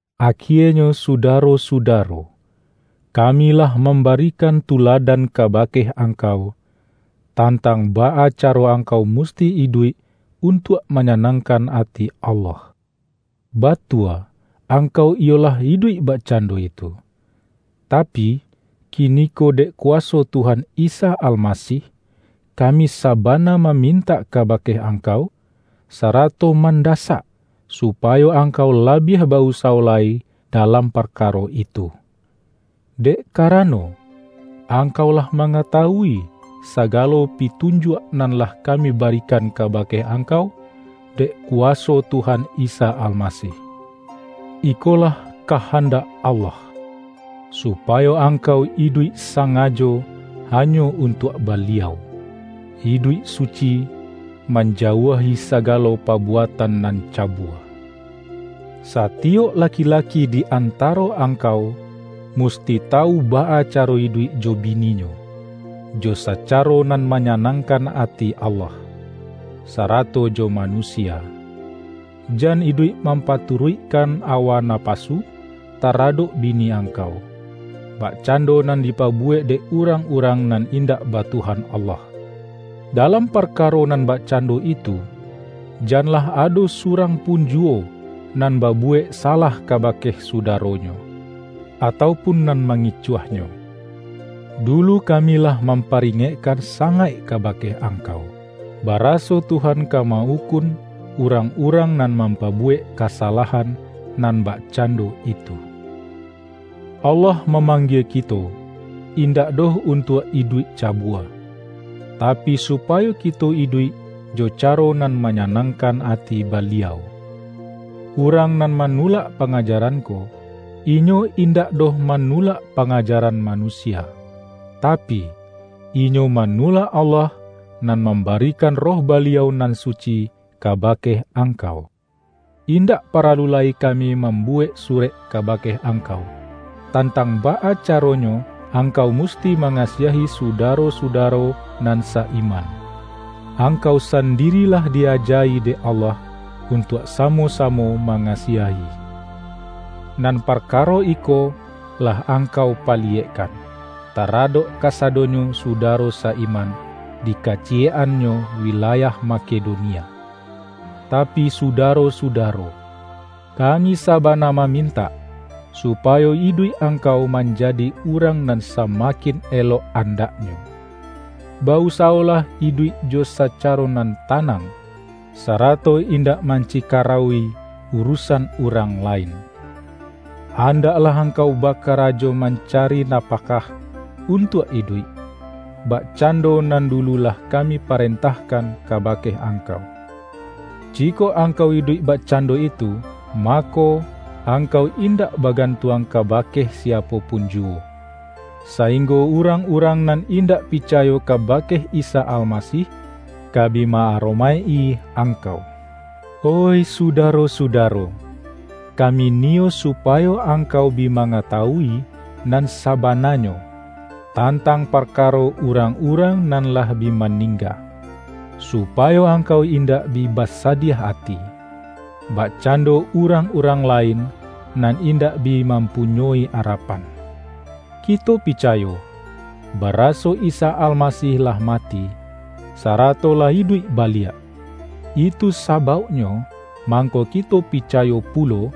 Akienyo sudaro-sudaro, kami lah mambarikan tuladan kabake ang-kau, tantang baa caro angkau musti iduik untuak manyanangkan ati Allah. Batua angkau iyo lah iduik bakcando itu. Tapi, kiniko dek kuwaso Tuhan Isa Almasih, kami sabana mamintak ka-bake angkau, sarato mandasak, supa-yo angkau labiah ba-usawo lai dalam parkaro itu! Dek karano, angkau lah mangatawui sagalo pitunjuak nan lah kami barikan kabake angkau dek ku-waso Tuhan Isa Almasih. Ikolah ka-handak Allah: Supayo angkau iduik sa-ngajo hanyo untuak Baliau, iduik suci, manjauahi sagalo pabuatan nan cabua. Satiyok laki-laki di antaro angkau, musti tawu baa caro iduik jo bininyo, jo sacaro nan manyanangkan ati Allah, sarato jo manusia. Jan iduik mam-paturuikkan awa napasu taradok bi-ni angkau, bakcando nan dipabuwek dek urang-urang nan indak ba Tuhan Allah. Dalam parkaro nan bakcando itu, janlah ado surang pun juwo nan babuwek salah kabake sudaronyo, atau pun nan mangicuahnyo. Dulu kami lah mamparingekkan sangaik kabake angkau, baraso Tuhan ka ma-ukun urang-urang nan mampabuwek kasalahan nan bak-cando itu. Allah mamanggie kito, indak doh untuak iduik cabua, tapi, supayo kito iduik jo caro nan manya-nangkan ati Baliau. Urang nan manu-lak pangajaran ko, inyo indak doh ma-nulak pangajaran manusia, tapi, inyo manulak Allah nan mambarikan Roh Baliau nan suci kabake angkau. Indak paralu lai kami mambuwek surek kabake angkau, tantang baa ca-ronyo angkau musti mangasiahi su-daro-sudaro nan sa-iman. Angkau sandiri lah di-aja-i dek Allah untuak samo-samo mangasiahi. Nan par-karo iko lah angkau paliyekkan, ta-radok kasadonyo sudaro sa-iman di kaciyek-annyo wilayah Makedonia. Tapi sudaro-sudaro, kami sabana ma-mintak, supayo iduik angkau manja-di urang nan samakin elok andaknyo. Ba-usawolah iduik jo sacaro nan tanang, sarato indak mancikarauwi urusan urang lain. Andaklah angkau bakarajo mancari napakah untuak iduik, bakcando nan dulu lah kami parentahkan kabake angkau. Jikok angkau iduik bakcando itu, mako, angkau indak bagantuang kabake si-apo pun juwo, sainggo urang-urang nan indak picayo kabake Isa Almasih, ka bi ma-aromaik-i angkau. Oih sudaro-sudaro, kami niyo su-payo angkau bi mangatawui nan saba-nanyo, tantang parkaro urang-urang nan lah bi maningga; supayo ang-kau indak bi basadiah ati, bakcando urang-urang lain nan indak bi mam-punyoi arapan. Kito picayo, baraso Isa Almasih lah mati, sarato lah iduik baliak. Itu sabauknyo mangko kito pi-cayo pulo,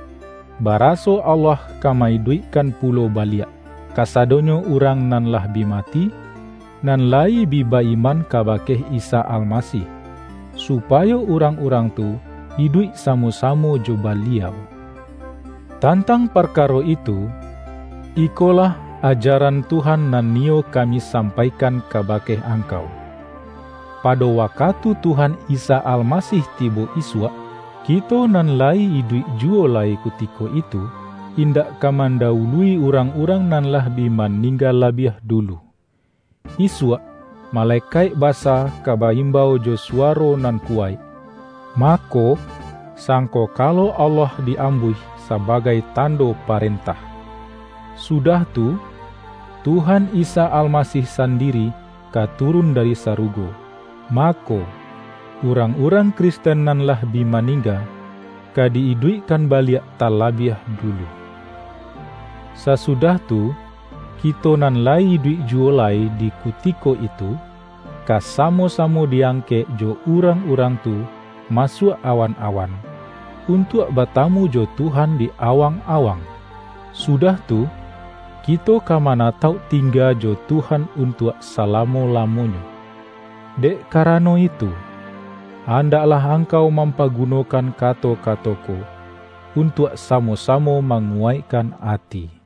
baraso Allah ka ma-iduik-kan pulo baliak, kasadonyo urang nan lah bi mati, nan layi bi ba-iman kaba-ke Isa Almasih, supayo urang-urang tu iduik samo-samo jo Baliau. Tantang parkaro itu, ikolah aja-ran Tuhan nan niyo kami sampaikan kabake angkau: Pado wakatu Tuhan Isa Almasih tibo isuak, kito nan la-yi iduik juwo lai kutiko itu, indak ka mandawului urang-urang nan lah bi maningga labiah dulu. Isuak, male-kaik basa ka ba-imbau jo suwaro nan kuwaik, mako, sangkokalo Allah di-ambuih sabagai tando parentah. Su-dah tu, Tuhan Isa Almasih sandiri ka turun dari sarugo, mako, urang-urang Kristen nan lah bi maningga, ka di-iduikkan baliak talabiah dulu. Sasu-dah tu, kito nan layi iduik juwo lai di kutiko itu, ka samo-samo di-angkek jo urang-urang tu masuak awan-awan, untuak batamu jo Tuhan di awang-awang. Sudah tu, kito ka manatauk tingga jo Tuhan untuak salamo-lamo-nyo. Dek karano itu, andaklah ang-kau mampagunokan kato-kato ko, un-tuak samo-samo manguwaikkan ati.